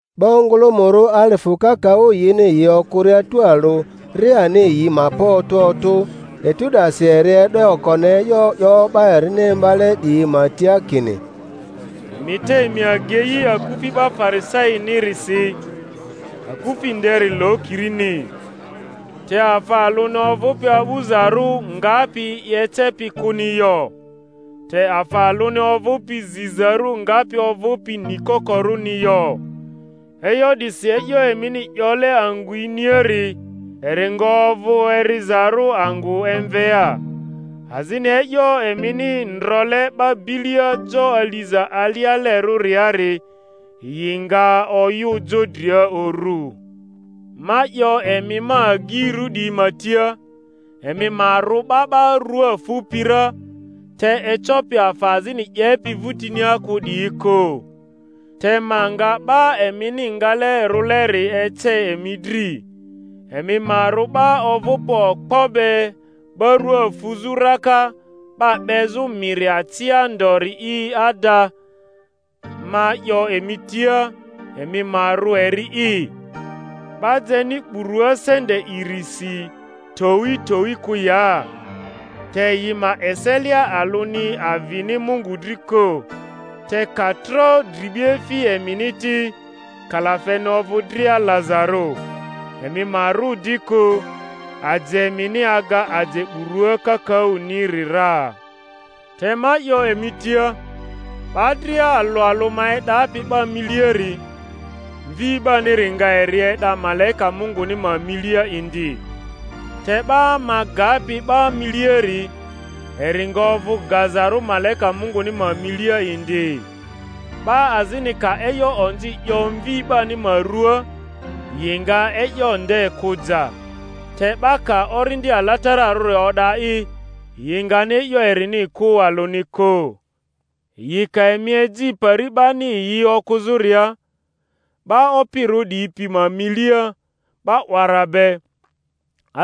'Ba ongᴜlᴜmᴜrᴜ alifᴜ kakaᴜ yini yi okᴜria tualᴜ, ri ani yi ma pa otᴜ otᴜ, etu 'dasi eri e'do okoni e'yo 'yo 'ba erini imbale 'diyi ma tia kini, Emi te emi agei akufi 'ba Farisainirisi, akufi nderi lokirini. Te afa alᴜni ovᴜpi a'bᴜzarᴜ ngapi. i ecepi kᴜni yo, te afa alᴜni ovᴜpi zizarᴜ ngapi ovᴜpi nikokorᴜni yo. E'yo 'disi e'yo emini 'yole angᴜ iniari, eri nga ovᴜ erizarᴜ angᴜ emvea, azini e'yo emini ndrole 'ba bilia jo aliza alialerᴜriari, yi nga oyᴜ jo dria uru. Ma 'yo emi ma agyirᴜ 'diyi ma tia, emi ma rᴜ 'ba 'ba rua fupi ra, te ecopi afa azini 'yepi vᴜtinia kᴜ 'diyi kᴜ. Te ma nga 'ba emini ngale rᴜleri ece emi dri: emi ma rᴜ 'ba ovᴜpi okpo be 'ba rua fuzᴜ raka 'ba 'bezᴜ miri acia ndori'i; ada, ma 'yo emi tia, emi ma rᴜ eri'i! 'Ba jeni burua sente irisi towi towi kᴜ ya? Te yi ma eselia alᴜni avini Mungu dri kᴜ. Te ka tro dribiefi emini ti, kalafeni ovᴜ dria lazarᴜ. Emi ma rᴜ di kᴜ: aje emini aga aje burua kakaᴜniri ra. Te ma 'yo emi tia, 'Ba dria alᴜ alᴜ ma e'dapi 'ba miliari, Mvi 'baniri nga eri e'da malaika Munguni ma milia indi; te 'ba ma gapi 'ba miliari, eri nga ovᴜ gazarᴜ malaika Munguni ma milia indi. 'Ba azini ka e'yo onzi 'yo Mvi 'bani ma ruaa, yi nga e'yo nde kᴜ ja; te 'ba ka Orindi Alatararᴜ o'da'i, yi ngani e'yo erini kᴜ alᴜni kᴜ. Yi ka emi eji pari 'bani yi okᴜzᴜria, 'ba opirᴜ 'diyi pi ma milia, 'ba 'wara be,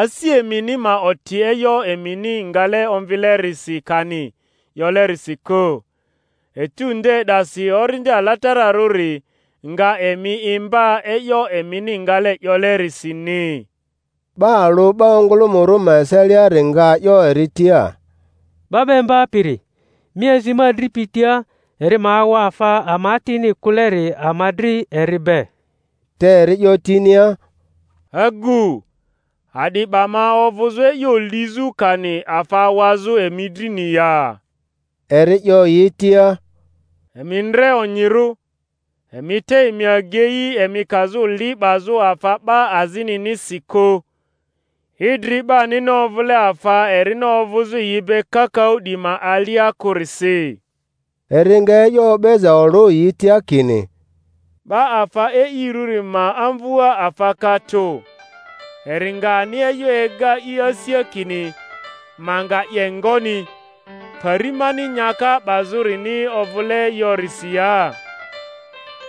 asi emini ma oti e'yo emini ngale omvilerisi kani 'yolerisi kᴜ; etu nde 'dasi Orindi Alatararᴜri nga emi imba e'yo emini ngale 'yolerisini. 'Ba alᴜ 'ba ongᴜlᴜmᴜrᴜ ma eseliari nga 'yo eri tia, 'Ba 'ba Imbapiri, mi azi ma adripi tia eri ma awa afa ama atini kᴜleri ama dri eri be. Te eri 'yo tinia, Agu, a'di 'ba ma ovᴜzᴜ e'yo lizᴜ kani afa awazᴜ emi drini ya? Eri 'yo yi tia, Emi ndre onyirᴜ, emi te emi agei emi kazᴜ li 'bazᴜ afa 'ba azininisi kᴜ; idri 'banini ovᴜle afa erini ovᴜzᴜ yi be kakaᴜ 'diyi ma alia kᴜrisi. Eri nga e'yo o'beza olᴜ yi tia kini, 'Ba afa e'irᴜri ma amvua afa ka tᴜ; eri nga ani e'yo ega i asia kini, Ma nga 'ye ngoni, pari mani nyaka 'bazᴜrini ovᴜle yorisi ya?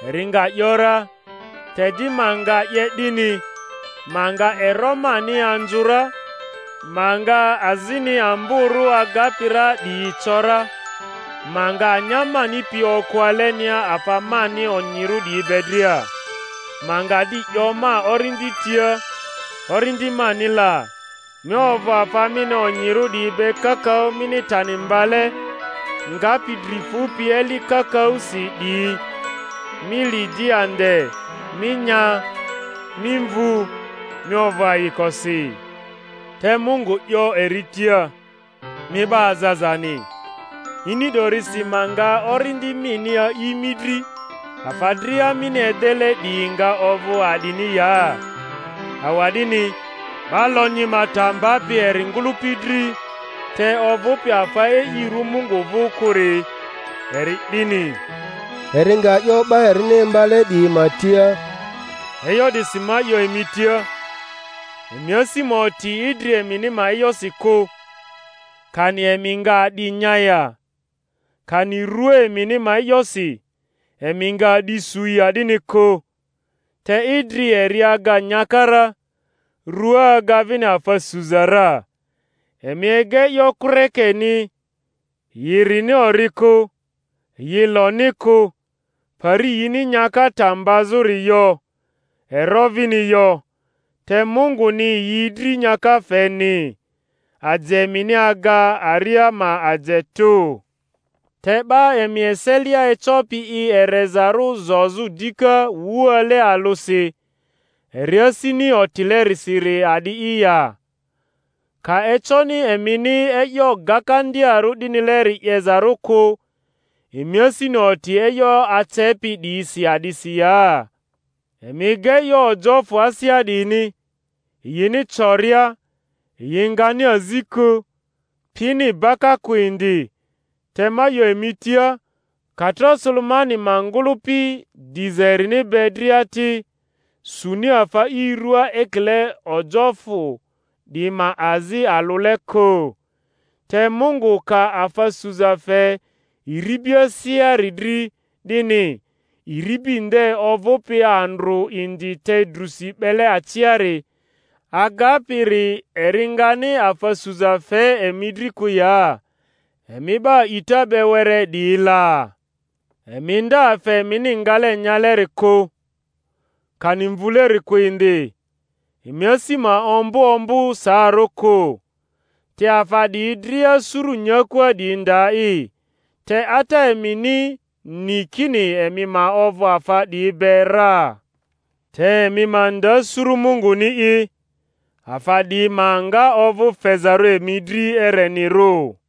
Eri nga ‘yora, Te di ma nga 'ye 'dini: ma nga ero mani anzᴜ ra, ma nga azini amborᴜ agapi ra 'diyi co ra; ma nga anya mani pi okᴜ alenia afa mani onyirᴜ 'diyi be dria. Ma nga di 'yo ma orindi tia, Orindi mani la, mi ovᴜ afa mini onyirᴜ 'diyi be kakaᴜ mini tani mbale, ngapi dri fupi eli kakaᴜsi 'diyi; mi li di ande, mi nya, mi mvu, mi ovᴜ ayikosi. Te Mungu 'yo eri tia, Mi 'ba azazani! Ini 'dorisi ma nga orindi mini a'i mi dri; afa dria mini edele 'diyi nga ovᴜ a'dini ya? Awa'dini 'ba lonyi ma ta mbapi eri ngᴜlᴜpi dri, te ovᴜpi afa e'irᴜ Mungu vᴜ kᴜri, eri 'dini. Eri nga 'yo 'ba erini imbale 'diyi ma tia, E'yo 'disi ma 'yo emi tia, emi asi ma oti idri emini ma e'yosi kᴜ, kani emi nga a'di nya ya; kani rua emini ma e'yosi, emi nga a'di su ya 'dini kᴜ. Te idri eri aga nyaka ra, rua aga vini afa suza ra. Emi ega e'yo kᴜrekeni: yi rini ori kᴜ, yi loni kᴜ, pari yini nyaka ta mbazᴜri yo, ero vini yo, te Munguni yi dri nyaka feni. Aje emini aga aria ma aje tᴜ! Te 'ba emi eselia ecopi i erezarᴜ zozᴜ dika wuale alᴜsi eri asini otilerisiri a'di'i ya? Ka econi emini e'yo gakandiarᴜ 'dinileri 'yezarᴜ kᴜ, emi asini oti e'yo acepi 'diyisi a'disi ya? Emi ega e'yo ojofᴜ asea 'diyini, yini coria; yi ngani azi kᴜ, pini baka kᴜ indi; te ma 'yo emi tia, ka tro Sulemani ma ngᴜlᴜpi diza erini be dria ti, suni afa i ruaa ekile ojofᴜ 'diyi ma azi alᴜle kᴜ. Te Mungu ka afa suza fe iribi aseari dri 'dini, iribi nde ovᴜpi andrᴜ indi te drusi 'bele aciari, agapiri eri ngani afa suza fe emi dri kᴜ ya, emi 'ba a'ita be were 'diyi la? Emi nda afa emini ngale nyaleri kᴜ, kani mvuleri kᴜ indi, emi asi ma ombᴜ ombᴜ saarᴜ kᴜ. Te afa 'diyi dria suru nyakua 'diyi nda'i; te Ata emini ni kini emi ma ovᴜ afa 'diyi be ra. Te emi ma nda suru Munguni'i, afa 'diyi ma nga ovᴜ fezarᴜ emi dri erenirᴜ.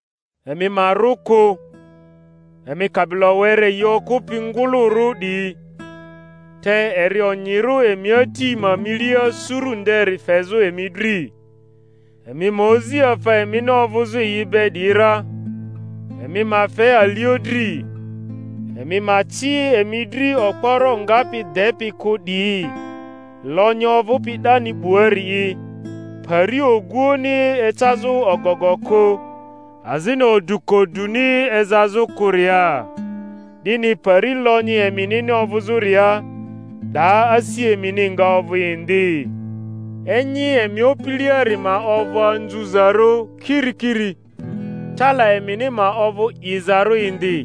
Emi ma rᴜ kᴜ, emi kabilo were yi okᴜpi ngᴜlᴜrᴜ 'diyi, te eri onyirᴜ emi Ati ma milia suru nderi fezᴜ emi dri. Emi ma ozi afa emini ovᴜzᴜ yi be 'diyi ra, emi ma fe alio dri; emi ma ci emi dri okporo ngapi depi kᴜ 'diyi, lonyi ovᴜpi 'dani 'buari'i, pari oguoᴜni ecazᴜ ogogo kᴜ, azini odukoduni ezazᴜ kᴜria. 'Dini pari lonyi eminini ovᴜzᴜria, 'daa asi emini nga ovᴜ indi. Enyi emi opiliari ma ovᴜ anzuzarᴜ kirikiri, tala emini ma ovᴜ 'izarᴜ indi,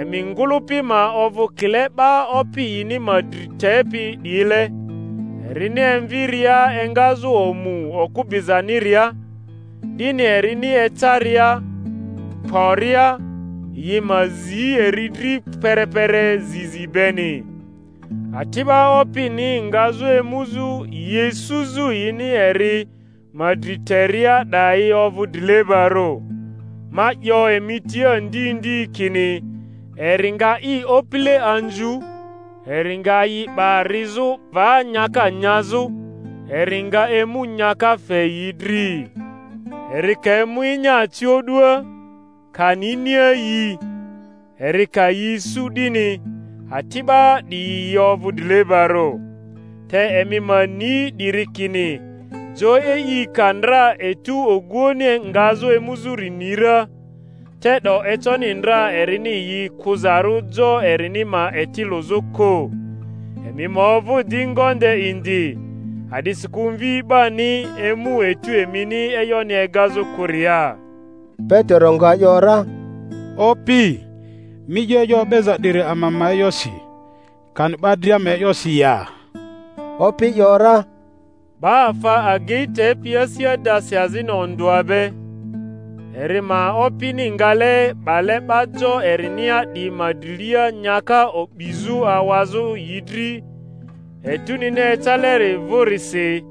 emi ngᴜlᴜpi ma ovᴜ kile 'ba opi yini ma dri tepi 'diyile, erini emviria engazᴜ omu okᴜ bizaniria, 'dini erini ecaria, kporia, yi ma zi eri dri perepere zi zi beni. Ati'ba opini ngazᴜ emuzᴜ yi isuzᴜ yini eri ma dri teria 'dayi ovᴜ drilebarᴜ; ma 'yo emi tia ndi ndi kini eri nga i opile anzu, eri nga yi 'ba rizᴜ va nyaka nyazᴜ, eri nga emu nyaka fe yi dri. Eri ka emu enyaacio'dua, kani iniayii, eri ka yi isu 'dini, ati'ba 'diyi yi ovᴜ drilebarᴜ. Te emi ma ni 'diri kini, jo e'i ka ndra etu oguoᴜni ngazᴜ emuzᴜri ni ra, te'do econi ndra erini yi kᴜzarᴜ jo erini ma eti lᴜzᴜ kᴜ. Emi ma ovᴜ di ngonde indi; a'disikᴜ Mvi 'bani emu etu emini e'yoni egazᴜ kᴜria. Petero nga ‘yora, Opi, mi 'yo e'yo o'beza 'diri ama ma e'yosi, kani 'ba dria ma e'yosi ya? Opi ‘yora, Ba afa agei tepi asi adasi azini ondᴜa be, eri ma opini ngale 'bale 'ba jo erinia 'diyi ma drilia nyaka o'bizᴜ awazᴜ yi dri etunini ecaleri vᴜsiri,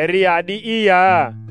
eri a'di'i ya?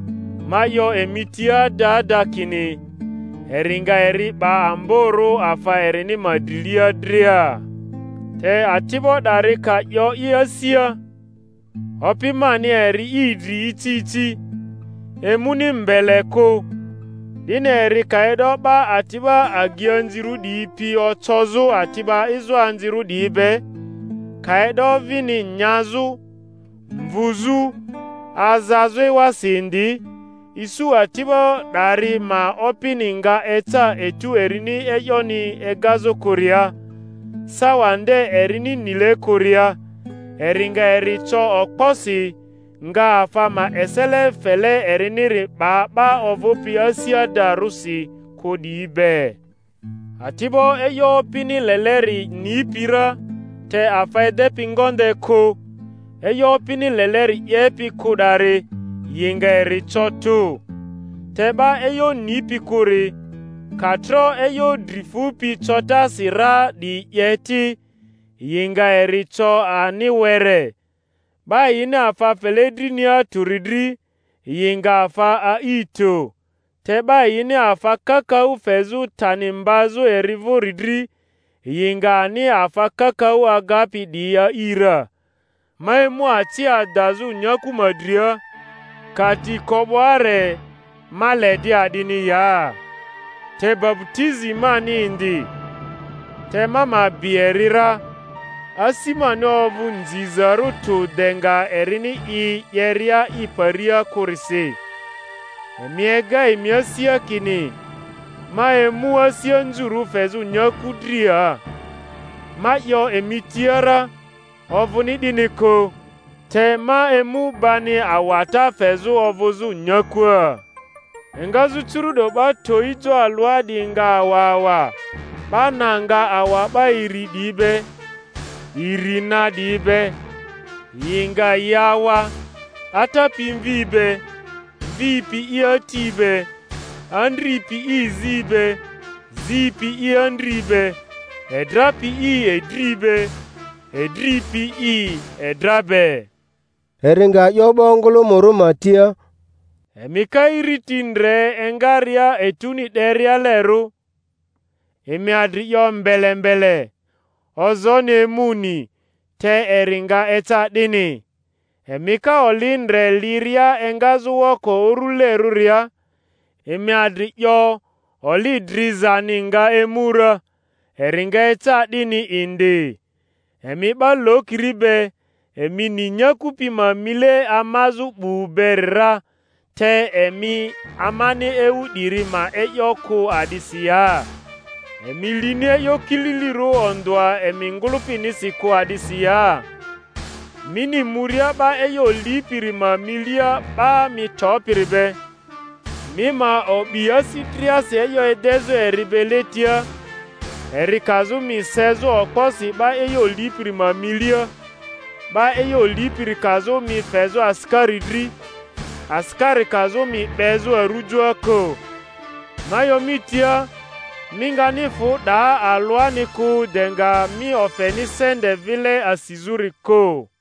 Ma 'yo emi tia ada ada kini, eri nga eri 'ba amborᴜ afa erini ma drilia dria. Te ati'bo 'dari ka 'yo i asia, Opi mani eri i dri ici ici, emuni mbele kᴜ; 'dini eri ka e'do 'ba ati'ba agianzirᴜ 'diyi pi ocozᴜ ati'ba ezoanzirᴜ 'diyi be, ka e'do vini nyazᴜ, mvuzᴜ, azazᴜ ewasi indi, isu ati'bo 'dari ma opini nga eca etu erini e'yoni egazᴜ kᴜria, sawa nde erini nile kᴜria, eri nga eri co okposi, nga afa ma esele fele eriniri 'ba 'ba ovᴜpi asi adarᴜsi kᴜ 'diyi be. Ati'bo e'yo opini leleri nipi ra te afa edepi ngonde kᴜ, e'yo opini leleri 'yepi kᴜ 'dari, yi nga eri co tᴜ. Te 'ba e'yo nipi kᴜri, ka tro e'yo dri fupi cotasi ra 'diyi 'ye ti, yi nga eri co ani were. 'Ba yini afa fele drinia tᴜri dri, yi nga afa a'i tᴜ; te 'ba yini afa kakaᴜ fezᴜ tani mbazᴜ eri vᴜri dri, yi nga ani afa kakaᴜ agapi 'diyi a'i ra. Ma emu aci adazᴜ nyaku ma dria; ka ti ko 'bo are, ma le di a'dini ya? Te baputizi mani indi, te ma ma bi eri ra; asi mani ovᴜ nzizarᴜ tᴜ de nga erini i 'yeria i paria kᴜrisi! Emi ega emi asia kini ma emu asi anzurᴜ fezᴜ nyaku dria? Ma 'yo emi tia ra, ovᴜni 'dini kᴜ, te ma emu bani awata fezᴜ ovᴜzᴜ nyakua; engazᴜ curu'do 'ba towi jo alᴜa 'diyi nga awa awa, 'ba na nga awa 'ba iri 'diyi be, iri na 'diyi be; yi nga yi awa, ata pi mvi be, mvi pi i ati be, andri pi i zi be, zi pi i andri be, edra pi i edri be edri pi i edra be. Eri nga 'yo 'ba ongᴜlᴜmᴜrᴜ ma tia, Emi ka iriti ndre engaria etuni 'derialerᴜ, emi adri 'yo mbele mbele, Ozooni emuni; te eri nga eca 'dini. Emi ka oli ndre liria engazᴜ woko urᴜlerᴜria, emi adri 'yo, Oli drizani nga emu ra; eri nga eca 'dini indi. Emi 'ba lokiri be! Emi ni nyaku pi ma mile amazᴜ 'bu beri ra; te emi amani ewu 'diri ma e'yo kᴜ a'disi ya? Emi lini e'yo kililirᴜ ondᴜa emi ngᴜlᴜpinisi kᴜ a'disi ya? Mini muria 'ba e'yo lipiri ma milia 'ba mi topiri be, mi ma o'bi asi driasi e'yo edezᴜ eri be letia, eri kazᴜ mi sezᴜ okposi 'ba e'yo lipiri ma milia, 'ba e'yo lipiri kazᴜ mi fezᴜ asikari dri, asikari kazᴜ mi 'bezᴜ arᴜjoa kᴜ. Ma 'yo mi tia, mi ngani fᴜ 'daa alᴜani kᴜ de nga mi ofeni sente vile asizᴜri kᴜ.